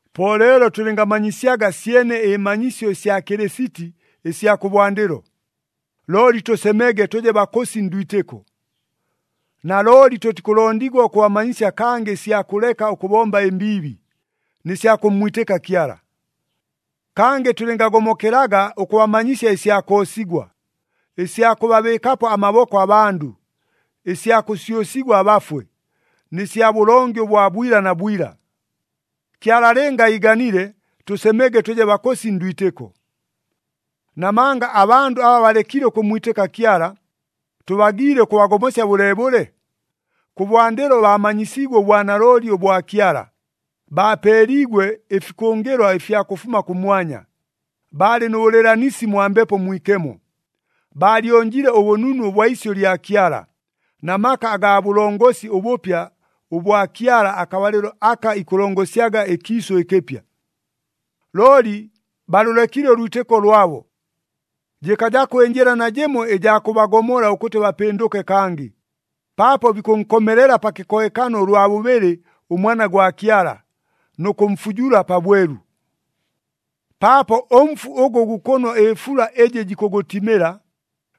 Po leelo tʉlɨngamanyisyaga syene ɨmanyisyo ɨsya Kɨlɨsiti ɨsya kʉbwandɨlo, looli tʉsemege tʉje bakʉsi ndwitɨko. Nalooli tʉtikʉlondigwa ʉkʉbamanyisya kangɨ ɨsya kʉleka ʉkʉbomba ɨmbiibi, nɨ sya kʉmmwitɨka Kyala! Kangɨ tʉlɨngagomokelaga ʉkʉbamanyisya ɨsya koosigwa, ɨsya kʉbabɨɨkapo amaboko abandʉ, ɨsya kʉsyʉsigwa abafwe, nɨ sya bʉlongi ʉbwa bwila na bwila. Kyala lɨnga iiganile, tʉsemege tʉje bakʉsi ndwitɨko. Namanga abandʉ aba balekile ʉkʉmmwitɨka Kyala, tʉbagiile ʉkʉbagomosya bʉleebʉle? Kʉbwandɨlo baamanyisiigwe ʉbwanalooli ʉbwa Kyala, baapeeliigwe ɨfikʉngɨlwa ɨfya kʉfuma kʉmwanya, baalɨ nʉ bʉlɨɨlanisi mwa Mbepo Mwikemo, baalyonjile ʉbʉnunu ʉbwa isyʉ lya Kyala, na maka agaa bʉlongosi ʉbʉpya ʉbwa Kyala akabalɨlo aka ikʉlongosyaga ɨkiisʉ ɨkɨpya. Looli balʉlekile ʉlwitɨko lwabo! Jɨkajako ɨnjɨla najɨmo ɨjaa kʉbagomola ʉkʉtɨ bapɨndʉke kangɨ, paapo bikʉnkomelela pa kɨkohekano ʉlwa bʉbɨlɨ ʉMwana gwa Kyala, nʉ kʉmfujula pabwelu. Paapo ʉmfu ʉgʉ gukʉnwa ɨfula ɨjɨ jikʉgʉtimɨla,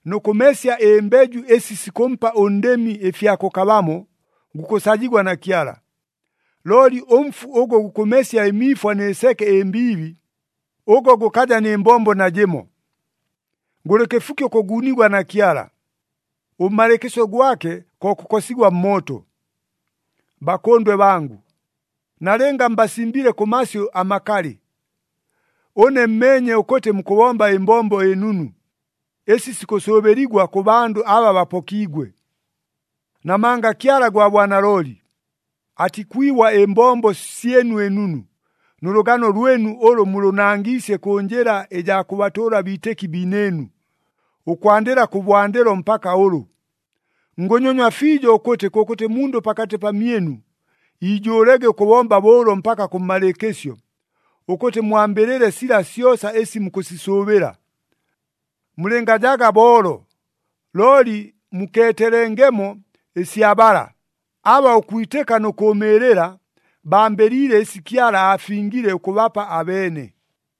nʉ kʉmesya ɨmbeju ɨsi sikʉmpa ʉndɨmi ɨfya kʉkabamo, gukʉsajigwa na Kyala. Looli ʉmfu ʉgʉ gukʉmesya ɨmiifwa nɨ seke ɨmbiibi, ʉgo gʉkaja nɨ mbombo najɨmo. Gʉlɨ kɨfuki ʉkʉgunigwa na Kyala, ʉmmalɨɨkɨsyo gwake ko kʉkosigwa mmooto. Bakʉndwe bangʉ, nalɨnga mbasimbiile kʉ masyʉ amakalɨ, ʉne mmeenye ʉkʉtɨ mukʉbomba ɨmbombo ɨnunu, ɨsi sikʉsʉʉbɨligwa kʉ bandʉ aba bapokiigwe. Namanga Kyala gwa bwanalooli. Atikwibwa ɨmbombo syɨnu ɨnunu, nʉ lʉgano lwɨnu ʉlʉ mulʉnangiisye kʉ njɨla ɨjaa kʉbatʉʉla abiitɨki biinɨɨnu, ʉkwandɨla kʉbwandɨlo mpaka ʉlʉ. Ngʉnyonywa fiijo ʉkʉtɨ kʉkʉtɨ mundʉ pakatɨ pamyɨnu, iijʉʉlege ʉkʉbomba bo ʉlo mpaka kʉmmalɨɨkɨsyo, ʉkʉtɨ mwambɨlɨle sila syosa ɨsi mukʉsisʉʉbɨla. Mulɨngajaga boolo, looli mukeetelengemo ɨsya bala, aba ʉkwitɨka nʉ kʉʉmɨɨlɨla, bambɨliile ɨsi Kyala aafingile ʉkʉbapa abeene.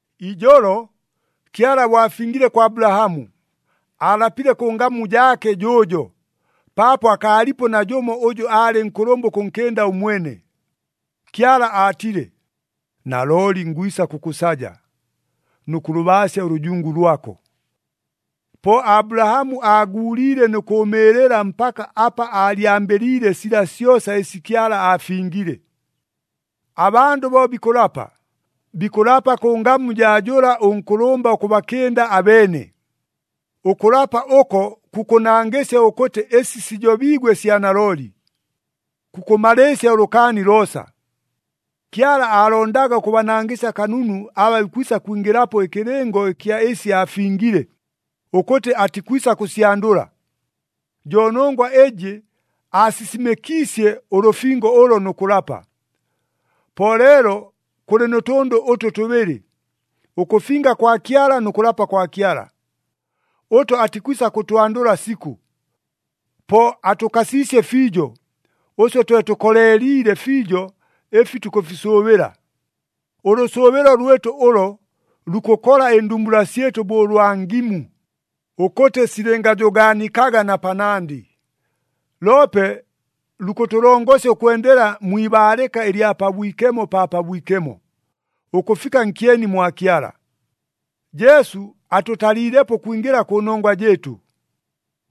Ijolo, Kyala bo afingile kwa Abulahamu, aalapile kʉ ngamu jaake jʉʉjo, paapo akaalipo najʉmo ʉjʉ aalɨ nkʉlʉmba ʉkʉnkɨnda ʉmwene. Kyala aatile, “Nalooli ngwisa kʉkʉsaja, nʉ kʉlʉbaasya ʉlʉjungu lwako.” Po Abulahamu aaguuliile nʉ kʉʉmɨɨlɨla mpaka apa aalyambɨliile sila syosa ɨsi Kyala aafingile. Abandʉ bo bikʉlapa, bikʉlapa kʉ ngamu jaa jʉla ʉnkʉlʉmba ʉkʉbakɨnda abeene. Ʉkʉlapa ʉko kukʉnangɨsya ʉkʉtɨ ɨsi sijobiigwe sya nalooli, kukʉmalɨɨsya ʉlʉkaani loosa. Kyala aalondaga ʉkʉbanangɨsya kanunu aba bikwisa kwingɨlapo ɨkɨlɨngo ɨkya ɨsi aafingile, ʉkʉtɨ atikwisa kʉsyandʉla. Jo nongwa ɨjɨ aasisimɨkiisye ʉlʉfingo ʉlo nʉ kʉlapa. Po leelo kʉlɨ nʉ tʉndʉ ʉtʉ tʉbɨlɨ, ʉkʉfinga kwa Kyala nʉ kʉlapa kya Kyala. Ʉto atikwisa kʉtwandʉla sikʉ. Po atʉkasiisye fiijo, ʉswe twe tʉkoleeliile fiijo ɨfi tukʉfisʉʉbɨla. Ʉlʉsʉʉbɨlo lwɨtʉ ʉlo lukʉkola ɨndumbula syɨtʉ bo ʉlwa ngimu, ʉkʉtɨ silɨngajʉgaanikaga na panandɨ. Loope lukʉtʉlongosya ʉkwendela mwi ibaalɨka ɨlya Pabwikemo pa Pabwikemo, ʉkʉfika nkyeni mwa Kyala. Jesu atʉtaliilepo ʉkwingɨla kʉnongwa jɨɨtʉ.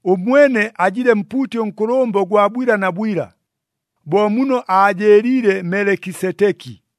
Ʉmwene ajile mpuuti ʉnkʉlʉmba ʉgwa bwila na bwila, bo muno aajɨɨliile Melekiseteki.